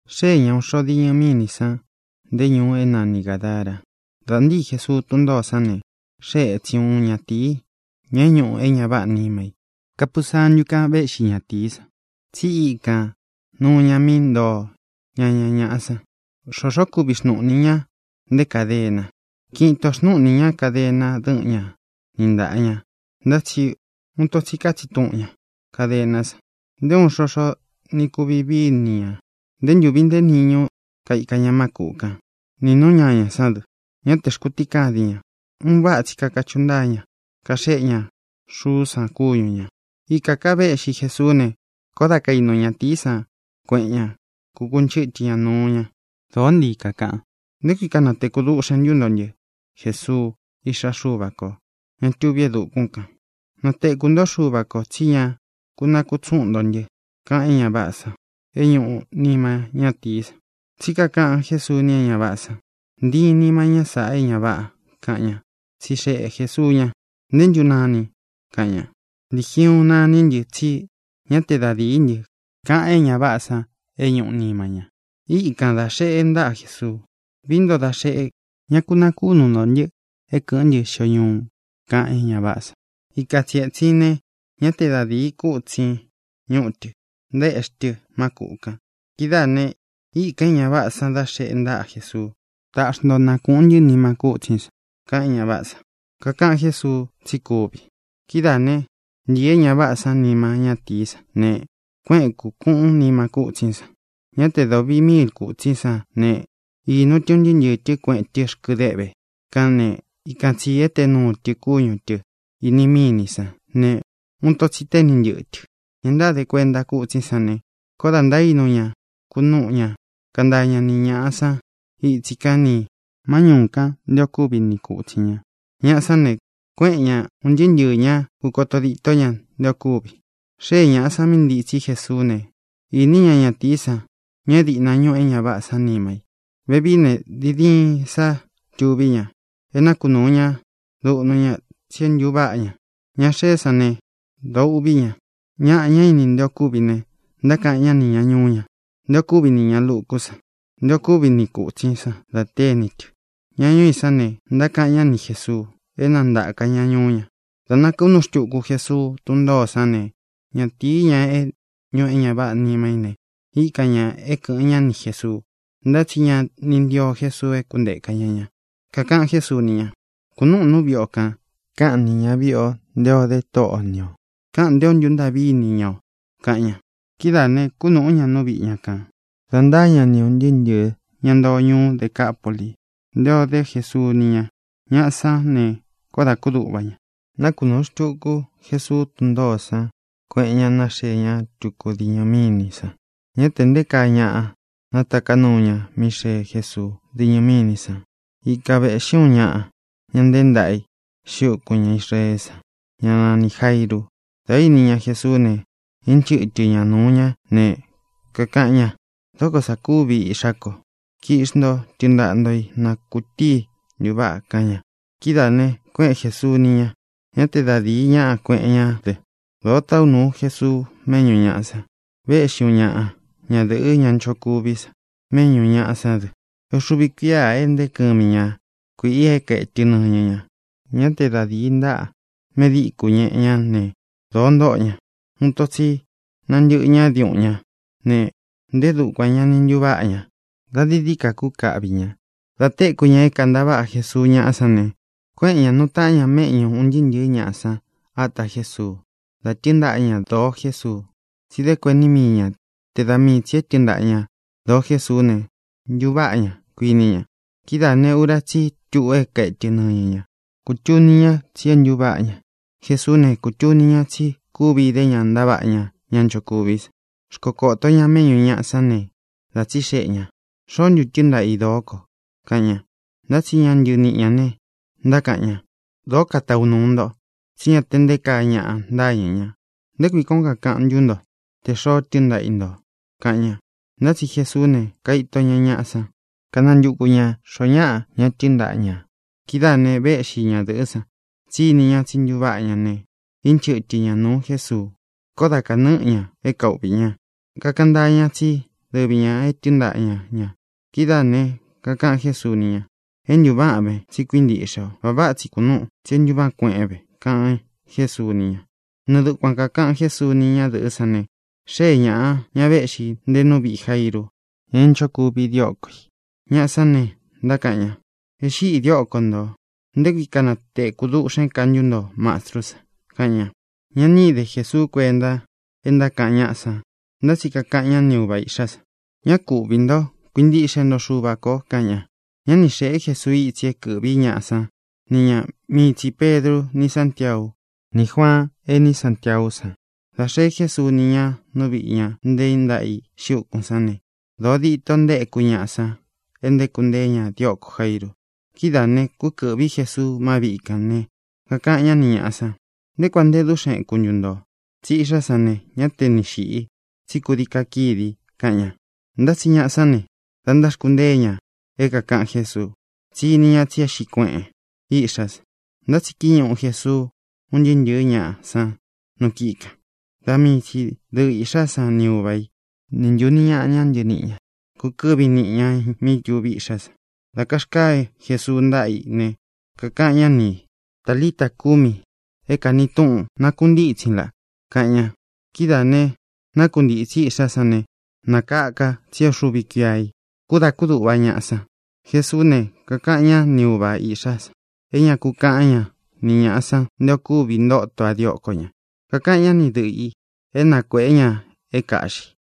Xée ña ūun xo diñɨ mínī san, nté ñūu é nani Gādara. Dā ntíi Jesuu tún ntōó san ne, xée ētsín uun ñatīi, ña é ñuꞌu é ña váꞌā nima i. Kapusantú kān véꞌxi ñatīí san, tsí ikān nuu ña mí ntoo ñaña ñāꞌa san. Xōxó kuvi xnūꞌni í ña, nté kadena. Kiꞌin itō xnúꞌni ñā kadena dɨ́ꞌɨn ña ni ntāꞌa ña, ntá tsi uun ito tsi kátsin tuꞌun ña kadená san. Nté uun xoxo ni kuvi vií i ni ñā. Nté ntūvi nte níñu kaika ña má kūꞌu kán, nī nú ñañā sán dɨ; ñá te xkūtíkadin ña. Un váꞌa tsi kakachuꞌu ntáa ña, kaxéꞌe ña xuú san kúñu ñā. Ikā ká veꞌxí Jesuú ne, koó da kainu ñatīí san kueꞌen ña, kukunchɨ́tɨ ña nuu ña. Dōó ntii kakaꞌan: —¿Nté kui kanatekū duꞌxen ntu ntó ntɨ, Jesuu, Iꞌxá Xuva kō, ña tuví e dukún kān? Natekū ntó Xuva kō tsí ña ku nakutsuꞌun ntō ntɨ —kaꞌan é ña váꞌā san é ñuꞌu nima ñátīí san. Tsí kakaꞌan Jésuu ni é ña váꞌā san: —¡Ntiin nima ñá sāꞌa, é ña váꞌā! —kaꞌan ña. Tsixeꞌe Jēsuu ña: —¿Nté ntu nanin? —kaꞌan ña. —Ligiuun naní ntɨ, tsí ña te da dií ntɨ —kaꞌan é ña váꞌā san é ñuꞌu nima ña. Īkan dá xeꞌe ntaꞌa Jesuu: —Vií nto da xeꞌe, ñá ku nakunū ntó ntɨ é kɨ̄ꞌɨ́n ntɨ xio ñuu —kaꞌan é ña váꞌā san. Ikan tsi ētsin ne, ñá te da dīi kútsin ñuꞌu tɨ, ntaéꞌxi tɨ má kūꞌu kan. Kidáā ne, íkan é ña váꞌā san da xeꞌe ntaꞌa Jesuu: —Taꞌxi nto na kūꞌun ntɨ́ nima kútsín san —kaꞌan é ña váꞌā san. Kakaꞌan Jésuu tsí kuvi. Kidáā né, ntīi é ña váꞌā san nima ñátīí san ne, kuéꞌen, kūkuꞌun nima kútsín san. Ñá te da ūvi míil kútsín san ne, īnu tɨ un ntɨɨ́ ntɨɨ̄ tɨ́, kueꞌen tɨ rkɨ deꞌve kán ne, ikan tsī éte nuu tɨ kúñu tɨ̄ ini mínī san, ne, uun ito tsi téni ntɨꞌɨ tɨ. Ña ntáde kuenta kútsín san ne, koó dā ntaínu ña kunúꞌu ña, kantaa ña ni ñāꞌa san ítsi kan nī má ñūu kan nté ō kúvi ni kūtsin ña. Ñaꞌa sán ne, kuéꞌen ña, ūn ntɨɨ́ ntɨɨ̄ ñá, kūkoto ditó ña nté ō kúvi. Xée ñāꞌa san mí ntitsí Jesuú ne, īní ña ñatīí san, ña é dīꞌna ñuꞌu é ña váꞌā san nima i. Vevií ne, diin diin sá tuví ña. É nakunūu ña duꞌnu ña, tsí é ntūváꞌa ña. Ña xeé san ne, dōo uꞌví ña. Ñaꞌa, ña ini nté ō kúvi ne, ntákaꞌan ñá nī ña ñuú ña nté ō kúvi nī ña lukú san, nté ō kúvi ni kūtsín san da téni tɨ. Ña ñuu i sán ne, ntákaꞌan ñá ni Jēsuu é na ntāka ña ñuú ña. Dā nakunúu xtuku Jesuu tún ntōó san ne, ñatīí, ña é ñūꞌu é ña váꞌā nima í ne, íkan ñā é kɨ̄ꞌɨn ñá ni Jēsuu. Ntá tsi ña ni ntío Jesuu é kuntēka ña ña. Kakaꞌan Jésuu ni ña: —Kūnúꞌūn nú viꞌi o kān. Káꞌan nī ñaviꞌi o nté ō dé Tóꞌo o ni ō. Káꞌān nté ō ntúntaꞌví ini ña o —kaꞌan ña. Kidáā ne, kúnūꞌú ña nú viꞌi ña kān, da ntáa ña ni ūn ntɨɨ́ ntɨ̄ɨ́ ña ntoo ñuú Decapuli nté ō dé Jesuu ni ña. Ñaꞌa sán ne, koó dā kúduꞌva ña. Nákunūu xtuku Jesuu tún ntōó san, kuéꞌen ña, nāxee ña tuku diñɨ mínī san. Ñá tē nté kaa ñaꞌa nátaká nuu ña mí xee Jésuu díñɨ mínī san. Ikan vēꞌxí uun ñaꞌa, ña nteé ntaꞌa i xiꞌi úkūn ña Israeé san, ñá nanī Jairu. Dā íni ña Jesuú ne, ínchɨtɨ ña nūu ñá ne, kakaꞌan ña: —Dóko sā kúvi iꞌxá ko. Kiꞌxi nto, tɨɨn ntaꞌa ntō í, na kūtíi ntuváꞌa —kaꞌan ña. Kidáā ne, kuéꞌen Jēsuu ni ña. Ñá te da dīi ñaꞌa kuéꞌen ñá dɨ. Dōo táꞌu nūu Jesuu méꞌñū ñaꞌa san. Véꞌxi uun ñaꞌa ñadɨ̄ꞌɨ́, ña nchokuví san, méꞌñū ñaꞌa sán dɨ. É uxuvi kuíā e nteé kɨmi ña kuīꞌi é kaetɨ nɨñɨ ña. Ñá te da dīí ntaꞌa medíku ñeꞌe ñá ne, dōo ntóꞌo ña. Uun ito tsi nantɨꞌɨ ñá diuꞌun ñá ne, ntē dúkuan ña ni ntuváꞌa ña; dā dií dií ka kúkaꞌvī ña. Dā téku ña é kāntaváꞌa Jesuu ñáꞌa sán ne, kuéꞌen ñā, nuu taꞌán ña méꞌñū un ntɨɨ́ ntɨ̄ɨ́ ñaꞌa san ata Jésuu, da tɨ́ɨn ntaꞌa ña dōo Jésuu, tsí dé kuení mii ña te da mii tsī é tɨɨn ntaꞌa ña dōo Jésuú ne, ntuváꞌa ña, kuiní ña. Kidáā ne, ura tsí i tuꞌu é kaetɨ nɨñɨ ña. Kūtuni ña tsí é ntuváꞌa ña. Jesuú ne, kūtuni ña tsí kuvi idé ña ntaváꞌa ña ña nchokuví san. Xkokōto ña méꞌñū ñaꞌa sán ne, dā tsíxeꞌe ñā: —¿Xoó ntu tɨɨn ntaꞌa i dōó ko? —kaꞌan ña. Ntá tsi ña ntɨniꞌi ñā ne, ntákaꞌan ña: —Dōó kataꞌu nūu nto, tsí ña te nté kaa ñaꞌa ntáñɨ̄ ña. ¿Nté kui kuān ó kakaꞌan ntú nto tē xoo tɨ́ɨn ntaꞌa i ntō? —kaꞌan ña. Ntá tsi Jesuú ne, kaito ña ñaꞌa san, kánantuku ñā xoo ñáꞌa ña tɨ́ɨn ntaꞌa ñā. Kidáā ne, véꞌxi ñadɨ̄ꞌɨ́ san, tsí ini ña tsí ntuváꞌa ña ne, ínchɨtɨ ña nūu Jésuu. Koó dā kanɨ́ꞌɨ ña é kauꞌvī ña. Kakaꞌan ntáa ña tsí dɨvi ñā e tɨ́ɨn ntaꞌa ña ñā. Kidáā ne, kakaꞌan Jésuu ni ña: —É ntūváꞌan ve, tsí kuíntiꞌxe o. Vā váꞌa tsi kunúꞌun, tsí é ntūváꞌan kueꞌen ve —kaꞌan Jésuu ni ña. Nɨɨ dukuan kākaꞌan Jésuu ni ñadɨꞌɨ́ san ne, xée ñāꞌa, ña véꞌxī nte nú viꞌī Jairu, ña é nchokuvi dióko ī. Ñaꞌa sán ne, ntákaꞌan ña: —E xíꞌi dióko ntō. ¿Nté kui kanatekū duꞌxén ka ntú nto Mastrú san? —kaꞌan ña. Ña ni íde Jesuu kuénta é ntákaꞌan ñáꞌa san, ntá tsi kakaꞌan ñá ni uva īꞌxá san: —Ñá ku uꞌvī ntó; kuintiꞌxe nto Xuva kō —kaꞌan ña. Ñá ni xēꞌé Jesuu itsi é kɨ̄ꞌví ñaꞌa san ni ña; mii tsī Pedru ni Sántiau ní Juaan, ení Santiaú san. Dā xee Jésuu ni ña nú viꞌī ña nteé ntaꞌa i xiꞌi úkūn sán ne, dōo dito ntaéku ñaꞌa san é ntaéku nteé ña diókō Jairu. Kidáā ne, kúkɨ̄ꞌví Jesuu má viꞌi kān ne, kakaꞌan ñá ni ñāꞌa san: —¿Nté kuān nte dúꞌxen eku ntu ntō? Tsí iꞌxá san ne, ñá te ni xīꞌi, tsí kūdii kakídi —kaꞌan ña. Ntá tsi ñaꞌa sán ne, da ntáxkuntée ña é kākaꞌan Jésuu, tsí ini ña tsí e xíꞌi kueꞌen iꞌxá san. Ntá tsi kíñuꞌu Jesuu un ntɨɨ́ ntɨ̄ɨ́ ñaꞌa san nu kíꞌi kān. Da mii tsi dɨꞌɨ īꞌxá san ni uva i, nī ntuni ñáꞌa ña ntɨniꞌi ñā kúkɨ̄ꞌví niꞌi ñā mí tuví iꞌxá san. Dā karkáa Jesuu ntáꞌa i ne, kakaꞌan ñá ni ī: —Talita, kumi (é kāni túꞌun: Nākuntítsin, laꞌ) —kaꞌan ña. Kidáā ne, nákuntītsí iꞌxá san ne, nakaka, tsí é uxuvi kuíā i. Koó dā kúduꞌva ñaꞌa san. Jesuú ne, kakaꞌan ñá ni uva īꞌxá san é ña ku kaꞌán ña ni ñāꞌa san nté ō kúvi ntóto a dióko ñā. Kakaꞌan ñá ni dɨꞌɨ ī é na kuēꞌé ña é kāꞌxi.